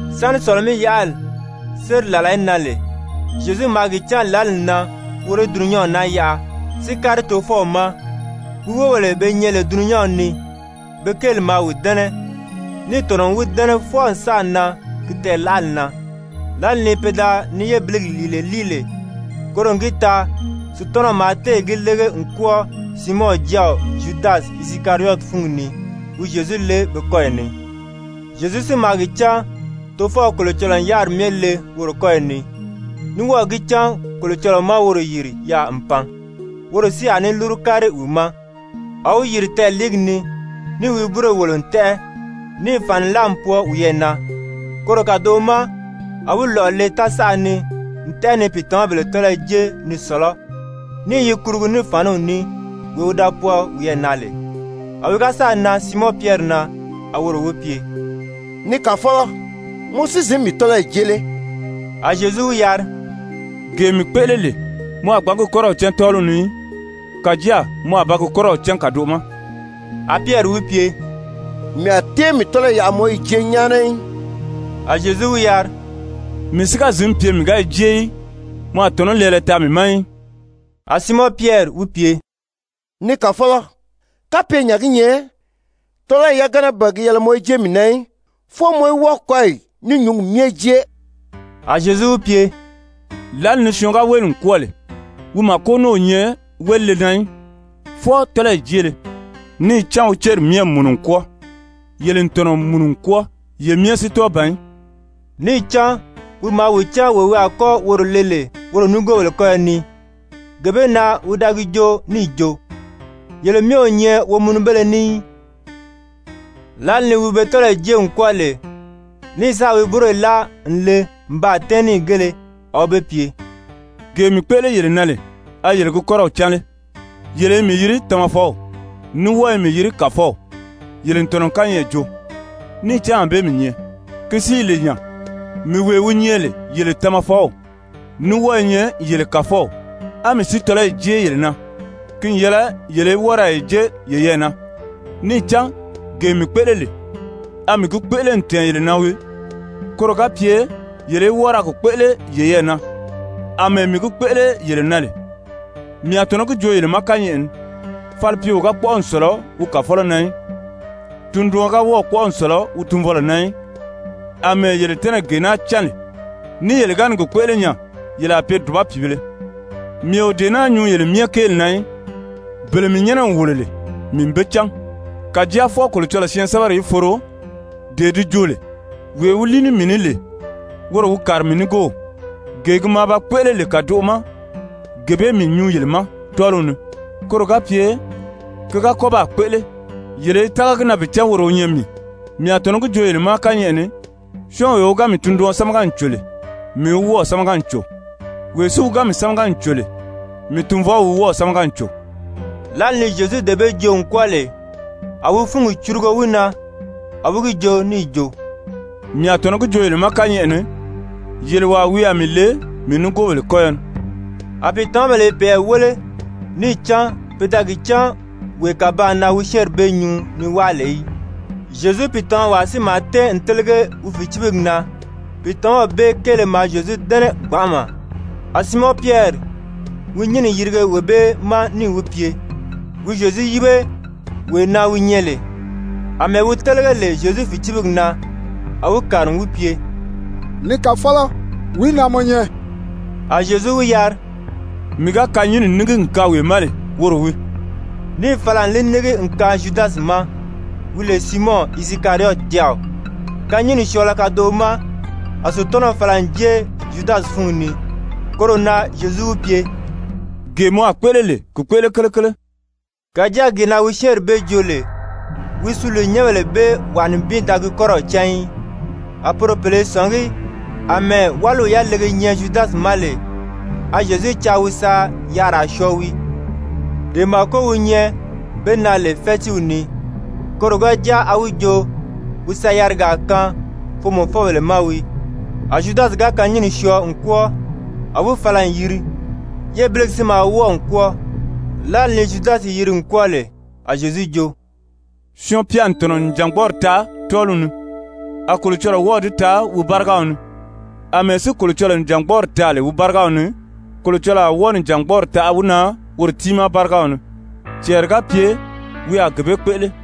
Sáni Sɔ̀lɔ-mí-yaʔali séri làla í nan lè, Zyezu maa gi cán lǎli n nan woro í dulunyanw naa yaʔa si kári Tofɔw ma, wi wóbèle be nyɛ lè dulunyanw ni, be kéeli maa wi dɛ́nɛ, níì tɔ̀nɔ n wi dɛ́nɛ fwɔɔ n sáà nan ki tɛɛ̀laʔali na. Lǎli ni pe da ni yébiligi lìile líi lè, koro n gi taa Sutanaw maa téè gi lége n kwɔ́ɔ Siimɔn jáaw Zyudasi Isikariyɔti fúngi ni, wi Zyezu le kɔyɔ ni. Zyezu si maa gi cán Tofɔw Kolocɔlɔɔ n yáriri myɛ le woro kɔ́yi ni, ní wɔ́ɔ̀ gi cán Kolocɔlɔɔ má woro yìri yaà n pan, woro si a ní lúru kári wi ma. A wi yìri tɛɛliigi ni níì wi búroyi wòlo n tɛ́ʔɛ, níì fàni láa n pwɔɔ wiyɛɛ na. Koro kàdoʔo ma a wi lɔ̀ʔɔ le tásaʔa ni n tɛ́ʔɛ ni pìitamabèle tɔ́lɔyɔ jé ni sɔ̀lɔ́, ní i yi kurugu ní fàniw ní, wee wi da pwɔɔ wiyɛɛ na lè. A wi ga sáà nan Siimɔn Pyɛri na, a woro wi pye: «Ni Kàfɔlɔ, mɔ si zǐn mii tɔ́lɔyi jée lé?» A Zyezu wi yari: «Gee mii kpéʔele lè, mɔ a gbǎn gi kɔ́rɔw cán tɔ́ɔliw ni í. Kàjáa mɔ a ba gi kɔ́rɔw cán kàdoʔo ma.» A Pyɛri wi pye: «Mii a tée mii tɔ́lɔyi yaʔa mɔ í yi jée nyáana í.» A Zyezu wi yari: «Mii si ga zǐn pye mii ga yi jée í, mɔ a tɔ̀nɔ́ lɛɛlɛ taa mii ma í.» A Siimɔn Pyɛri wi pye: «Ni Kàfɔlɔ, kapye nya gi nyɛ, tɔ́lɔyi yagana ban gi yɛlɛ mɔ í jée mii na í, fwɔɔ mɔ í wɔ́ɔ kɔ́yi ní nyǔngi myɛ jée.» A Zyezu wi pye: «Lǎli ni syɔɔn wéli n kwɔ́ɔ lè, wi màko a ní pye wélile na í, fwɔɔ tɔ́lɔyi jéele, níì cán wi céri myɛ n mùnu n kwɔ́ɔ. Yele n tɔ̀nɔ n mùnu n kwɔ́ɔ, kàjáa ye myɛ si tɔ́ɔ ban í.» Níì cán wi maa wi cán wee wi a kɔ́ woro le lè woro nigoobèle kɔ́yɔ ni, gee bee na wi da gi joo níì jo: «Yele myɛ o nyɛ womunubéle ní í.» Lǎli ni wi be tɔ́lɔyi jée n kwɔ́ɔ lè ní sáà wi búroyi láa n le n baa tɛ́ɛn níìgēle, a wi be pye: «Gee mii kpéʔele yele na lè, a yele gi kɔ́rɔw cán lé? Yele i mii yiri Tamafɔw, ní wɔ́ɔ i mii yiri Kàfɔw. Yele n tɔ̀nɔ n kányɛʔɛ joo, níì cán ànbée mii nyɛ. Ki si i lè nya, mii wee wi nyɛ lè yele Tamafɔw ní wɔ́ɔ i nyɛ yele Kàfɔw, a mii si tɔ́lɔyi jée yele na, ki n yɛlɛ yele í wɔ́ɔ ra yi jé yeyɛɛ na. Níì cán gee mii kpéʔele lè, a mii gi kpéʔele n tɛ̀ɛn yele na wii, koro ga pye yele í wɔ́ɔ ra gi kpéʔele yeyɛɛ na, àmɛɛ mii gi kpéʔele lè yele na. Mii a tɔ̀nɔ́ gi joo yele ma kányɛʔɛ ni, falipyeo ga kpɔ́ʔɔ n sɔ̀lɔ wi kàfɔlɔ na í, tunduɔn ga wɔ́ɔ̀ kpɔ́ʔɔ n sɔ̀lɔ wi tunvɔlɔ na í. Amɛɛ yele tɛ́nɛ̀ gee naa cán lè, ní yele ga ni gi kpéʔele nya, yele a pye dùba pìibēle. Mii o dee naa nyuu yele myɛ kéeli na í. Bele mii nyɛ́nɛ n wòlo lè, mii n be cán. Kàjáa fwɔɔ Kolocɔlɔɔ syɛɛnsɛbɛri í foro, dee di jo lè: ‹Wee wi líi ní mii ní lè, woro wi kàri mii nigoow.› Gee gi maa ba kpéʔele lè kàdoʔo ma, gee bee mii nyuu yele ma tɔ́ɔliw ni, koro ga pye ki ga kɔ́ baa kpéʔele, yele í tága gi na bi cán woro wi nyɛ mii. Mii a tɔ̀nɔ́ gi joo yele ma kányɛʔɛ ni, syɔ́ɔnwee wi ga mii tunduɔn sámaga n cò lè, mii wi wɔ́ɔ̀ sámaga n cò, wee si wi ga mii sámaga n cò lè, mii Tunvɔw wi wɔ́ɔ̀ sámaga n cò.» Lǎli ni Zyezu dee bee joo n kwɔ́ɔ lè, a wi fúngi curugo wi na, a wi gi joo níì jo: «Mii a tɔ̀nɔ́ gi joo yele ma kányɛʔɛ ni, yele wàa wi a mii le mii nigoobèle kɔ́yɔ ni.» A pìitamabèle i peyɛɛ wéle níì cán pe da gi cán wee kàbaan na wi syɛ́ɛnri bee nyuu ni wáa lè í. Zyezu pìitamawaa si maa tɛ́ɛn n télege wi fìcibigi na, pìitamaw bee kéele maa Zyezu dɛ́nɛ gbanʔama. A Siimɔn Pyɛri wi nyínni yirige wee bee ma níì wi pye wi Zyezu yíbe wee na wi nyɛ lè. Amɛɛ wi télege lè Zyezu fìcibigi na, a wi kàri n wi pye: «Ni Kàfɔlɔ, wìí na mɔ nyɛ?» A Zyezu wi yari: «Mii ga kanyinni nígi n kaan wee ma lè, woro wii.» Níì fala n li nígi n kaan Zyudasi ma, wi lè Siimɔn Isikariyɔti jáaw. Kanyinni syɔɔlɔ kadoʔo ma, a Sutanaw fala n jée Zyudasi fúngi ni. Koro na Zyezu wi pye: «Gee mɔ a kpéʔele lè, ki kpéʔele kelekele.» Kàjáa gee na wi syɛ́ɛnri bee joo lè, wi suliinyɛnbèle bee wàa nibin da gi kɔ́rɔw cán í. A poro pèle i sɔ̀ngí àmɛɛ wáliw yalege nyɛ Zyudasi ma lè, a Zyezu caa wi sa yarira syɔɔ wii, dee màko wi nyɛ be na lè fɛ́tiiw ni, koro ga jáa a wi jo wi sa yarigaa kaan foomɔfɔbèle ma wii. A Zyudasi ga kanyinni syɔɔ n kwɔ́ɔ, a wi fala n yiri. Yébiligi si maa wɔ́ɔ n kwɔ́ɔ. Lǎli ni Zyudasi yiri n kwɔ́ɔ lè, a Zyezu jo: «Syɔɔn-pya n tɔ̀nɔ n nìjangbɔɔri taa tɔ́ɔliw ni, a Kolocɔlɔɔ wɔ́ɔ̀ di taa wi bárigaw ni. Amɛɛ si Kolocɔlɔɔ nìjangbɔɔri taa lè wi bárigaw ni, Kolocɔlɔɔ a wɔ́ɔ nìjangbɔɔri taʔa wi na woro tiimaa bárigaw ni, cɛɛri ga pye wi a gee bee kpéʔele.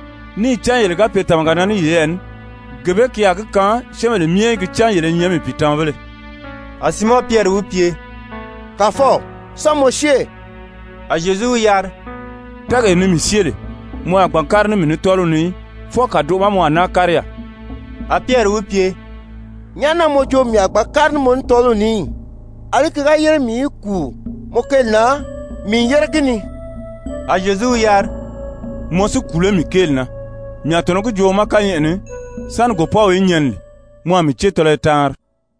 Níì cán yele ga pye tàmaga na ní yeyɛɛ ní, gee bee ki a gi kaan syɛ́ɛnbèle myɛ í gi cán yele i nyɛ mii pìitamabéle A Siimɔn Pyɛri wi pye: «Kàfɔw, sán mɔ syée?» A Zyezu wi yari: «Tɛ́ɛgee ni mii syée lè, mɔ a gbǎn kári ní mii ní tɔ́ɔliw ni í, fwɔɔ kàdoʔo ma mɔ a náa kári yaà.» A Pyɛri wi pye: «Nyàʔá na mɔ jo mii a gbǎn kári ní mɔ ní tɔ́ɔliw ni í? Alí ki ga yére mii í kùu mɔ kéeli na, mii n yére gi ni.» A Zyezu wi yari: «Mɔ si kùu lé mii kéeli na? Mii a tɔ̀nɔ́ gi joo mɔ ma kányɛʔɛ ni, sáni gòpɔ́w í nyɛni lè, mɔ a mii cée tɔlɔyɔ taanri.»